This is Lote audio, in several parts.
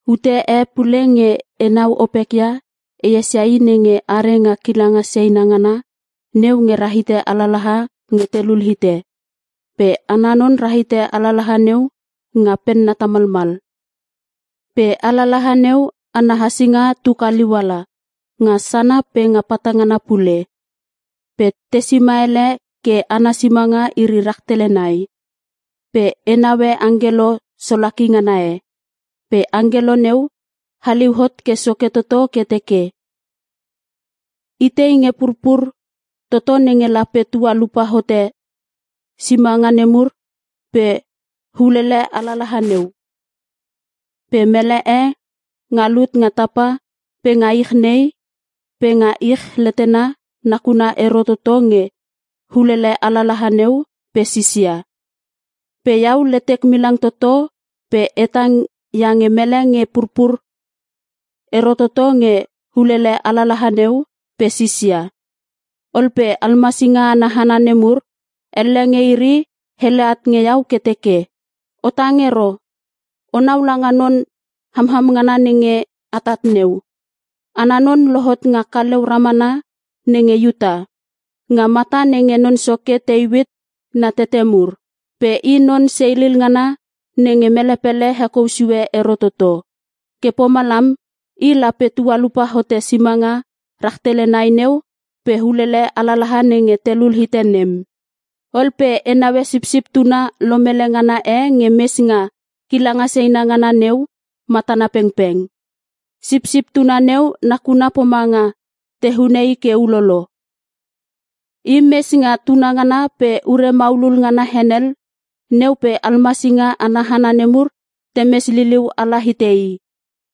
Ute e pule nge enau opek ia, e esia I nenge are nga kilanga seina ngana neu nge rahite alalaha e nge telul hite. Pe ana non rahite alalaha neu nga penna tamalmal. Pe alalaha neu ana hasinga tu kaliu ala, nga sana pe nga patangana pule. Pe te sima ele ke ana simanga iri rahtele nai. Pe e naue angkelo solaki ngana e. Pe angkelo neu haliu hot ke soke toto ke teke, “Itei nge purpur toto nenge lape tualupa hote simanga nemur pe ulele alalaha neu?” Pe mele e nga lut nga tapa pe nga ich nei pe nga ich letena nakuna ero toto nge ulele alalaha neu pe sisia. Pe iau letek milang toto pe e tang iange mele nge purpur ero toto nge ulele alalaha neu pe sisia. Ol pe almasinga ana hana nemur, elle nge iri hele at nge iau ke teke, “O tang ero! Onau langa Non hamam ngana nenge atat neu; ana non lohot nga kaleu ramana nenge Iuta (nga mata nenge non soke Teuit na tete mur). Pe I non seilil ngana nenge mele pele hekou sue ero toto. Ke pomalam I lape tualupa hote simanga rahtele nai neu pe ulele alalaha nenge telul hite nem.” Ol pe e naue Sipsip Tuna lomele ngana e nge mes nga kilanga seina ngana neu matana pengpeng. Sipsip Tuna neu nakuna pomanga te hune I ke ulolo. I mes nga tunangana pe ure maulul ngana henel neu pe almasinga ana hana nemur temes liliu ala hite I.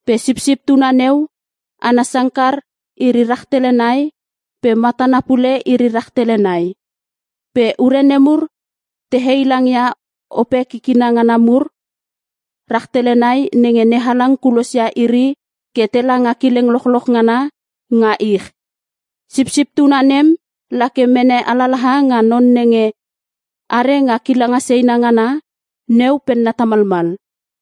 Pe Sipsip Tuna neu ana sangkar iri rahtele nai pe matana pule iri rahtele nai. Pe ure nemur te heilangia Ope kikina ngana mur rahtele nai nenge NeHalang kulosia iri ke tela nga kileng lochloch ngana nga ich. Sisip tuna nem la ke mene alalaha nga non nenge are nga kilanga seina ngana neu penna tamalmal.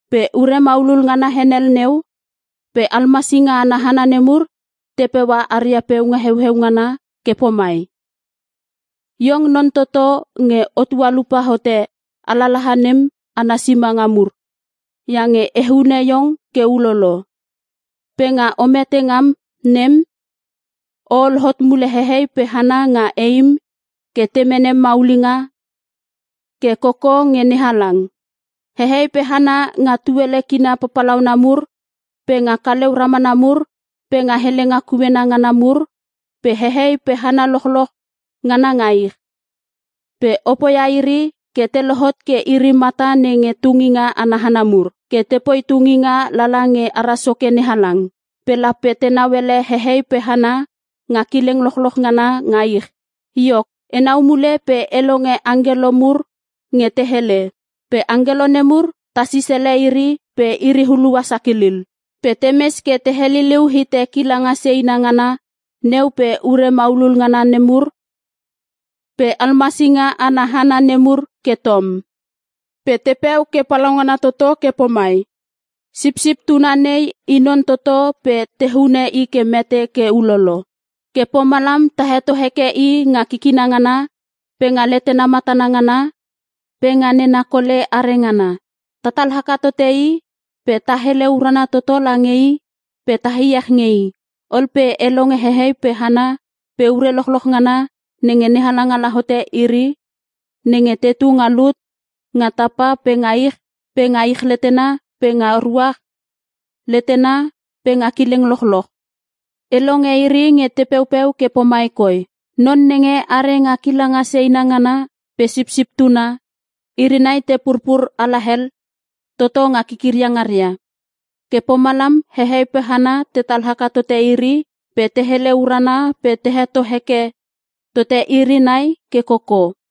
Pe ure maulul ngana henel neu pe almasinga ana hana nemur te peua aria peunga heueu ngana ke pomai, “Iong non toto nge o tualupa hote alalaha nem ana simanga mur iange te hune iong ke ulolo. Pe nga o mete ngam nem, o ol hot mule hehei pe hana nga eim ke te mene maulinga ke koko nge NeHalang. Hehei pe hana nga tuele kina papalauna mur pe nga kaleu ramana mur pe nga helenga kuena ngana mur pe hehei pe hana lochloch ngana nga ich. Pe o poia iri ke te lohot ke iri mata nenge tunginga ana hana mur, ke tepoi tunginga lala nge ara Soke NeHalang. Pe lape tenau ele hehei pe hana nga kileng lochloch ngana nga ich.” Iok, enau mule pe e longe angkelo mur nge te helele. Pe angkelo nemur ta sisele iri pe iri hulua sakilil. Pe temes ke te heliliu hite kilanga seina ngana neu pe ure maulul ngana nemur pe almasinga ana hana nemur ke tom. Pe tepeu ke palaungana toto ke pomai: “Sipsip Tuna nei I Non toto pe te hune I ke mete ke ulolo. Ke pomalam ta heto heke i nga kikina ngana pe nga letena matana ngana pe nga nena kole are ngana. Tatal haka tote I pe ta hele urana toto lange I pe ta iech nge I.” Ol pe e longe hehei pe hana pe ure lochloch ngana nenge NeHalang ala hote iri nenge tetu nga lut nga tapa pe nga ich pe nga ich letena pe nga ruach letena pe nga kileng lochloch, e longe iri nge te peupeu ke pomai koi, “Non nenge are nga kilanga seina ngana pe Sipsip Tuna iri nai te purpur alahel toto nga kikiria ngaria. Ke pomalam hehei pe hana tetal haka tote iri pe te hele urana pe te heto heke tote iri nai ke koko.”